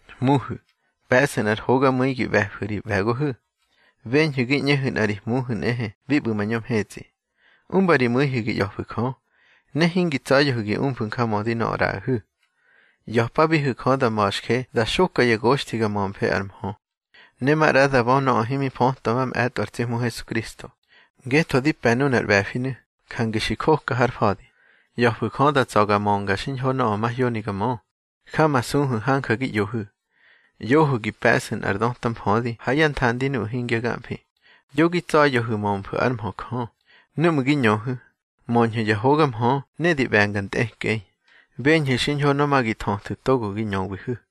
Hmuhu̱, pe̱ꞌsu̱ nꞌar hogamu̱i gi ꞌbe̱fu̱ ri ꞌbe̱gohu̱. Beñhu̱ gi ꞌñehu̱ nꞌa ri Hmuhu̱ nꞌehe bi ꞌbu̱ mañö mhetsꞌi. Umba ri mu̱ihu̱ gi ꞌya̱fu̱ Jö, ne hingi tsa̱ya̱hu̱ gi umfu̱ njamödi nöꞌö ꞌraꞌahu̱. ꞌYa̱pabihu̱ Jö da ma̱xje da xoka ya goxthi ga mömfe ár mhö, ne maꞌra da bö nöꞌö himi fötwa mamꞌe̱tꞌo ar tsi Hmu Hesukristo. Ngetho di pe̱ nunar ꞌbe̱finu̱, jange xi joka har fa̱di. ꞌYa̱fu̱ Jö da tsa̱ ga mönga xiñho nöꞌö mahyoni ga mö. Jamasuhu̱ hanja gi ꞌyohu̱. ꞌYohu̱ gi pe̱ꞌsu̱ nꞌar döta mfödi ha yá nthandi nuꞌu̱ hingya gamfi. Yo gi tsa̱ya̱hu̱ mömfu̱ ár mhö Jö. Núꞌmu̱ gi ñöhu̱, möñhu̱ ya hoga mhö ne di ꞌbe̱nga ntꞌekꞌei. Beñhu̱ xiñho nöꞌö ma gi thöthu̱ togo gi ñöwihu̱.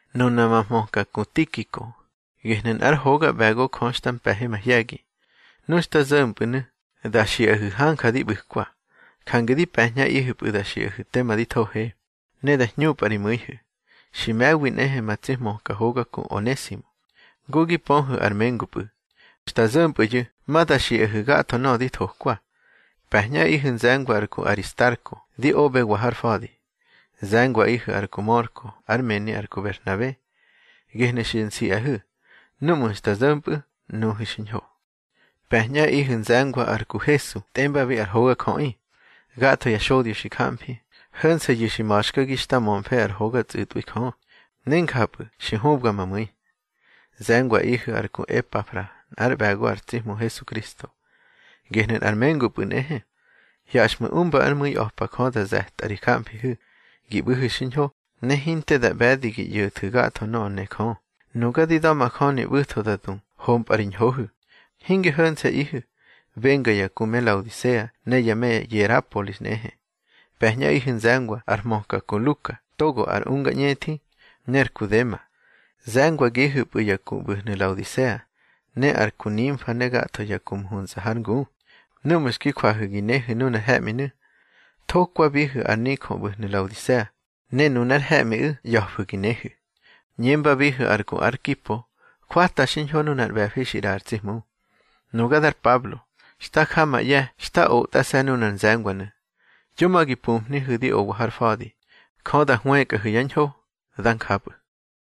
Nuna ma hmöka ku Tikiko, gehnu̱ nꞌár hoga ꞌbe̱go Jö xta mpe̱he mahye̱gi. Nu xta zo̱mpꞌu̱nu̱, da xiꞌahu̱ hanja di ꞌbu̱kwa. Jange di pe̱ñꞌaꞌihu̱pꞌu̱ da xiꞌahu̱ tema di thohe, ne da hñupꞌa ri mu̱ihu̱. Xi me̱wi nꞌehe ma tsi hmöka hoga ku Onesimo, ngu gi pöhu̱ ar mengupꞌu̱. Xta zo̱mpꞌu̱yu̱ ma da xiꞌahu̱ gatho nöꞌö di thokwa. Pe̱ñꞌaꞌihu̱ nze̱ngwa ar ku Aristarko di oꞌbewa har fa̱di. Ze̱ngwaꞌihu̱ ar ku Mörko ár mëni ar ku Berhnabe. Gehnu̱ xi nsiꞌahu̱; núꞌmu̱ xta zo̱mpꞌu̱, nuhu̱ xiñho. Pe̱ñꞌaꞌihu̱ nze̱ngwa ar ku Hesu tꞌembabi ar Hogajöꞌi. Gatho ya xodyo xi jamfi, ho̱nse̱yu̱ xi ma̱xkagi xta mömfe ár hoga tsꞌu̱tꞌwi Jö, ne njapꞌu̱ xi hubga ma mu̱i. Ze̱ngwaꞌihu̱ ar ku Epafra nꞌár ꞌbe̱go ar tsi Hmu Hesukristo. Gehnu̱ nꞌar mengupꞌu̱ nꞌehe. Hyaxꞌmu̱ umba ár mu̱i a̱pa Jö da ze̱tꞌa ri jamfihu̱, gi ꞌbu̱hu̱ xiñho, ne hinte da ꞌbe̱di gi ꞌyo̱thu̱ gatho nöꞌö ne Jö. Nuga di da̱majöni ꞌbu̱tho da du hompꞌa ri ñhohu̱. Hinge ho̱nse̱ꞌihu̱, benga ya ku me Laodisea ne ya me Yerapolis nꞌehe. Pe̱ñꞌaꞌihu̱ nze̱ngwa ar hmöka ku Luka togo ar unga ñꞌethi, ne ar ku Dema. Ze̱ngwagihu̱pꞌu̱ ya ku ꞌbu̱hnu̱ Laodisea, ne ar ku Nimfa ne gatho ya ku mhunsa hár ngu. Núꞌmu̱ xki jwahu̱ gi nehu̱ nunar he̱ꞌminu̱, thokwabihu̱ ar nijö ꞌbu̱hnu̱ Laodisea, ne nunár he̱ꞌmiꞌu̱ ꞌya̱fu̱ gi nehu̱. ꞌÑembabihu̱ ar ku Arkipo: Jwata xiñho nunar ꞌbe̱fi xi ꞌraꞌa ar tsi Hmu. Nuga dar Pablo, xta ja ma ꞌye̱ xta otꞌase̱ nunar nze̱ngwanu̱. Yo ma gi pumhnihu̱ di owa har fa̱di. Jö da hwëkꞌahu̱ yá ñho. Dá njapꞌu̱.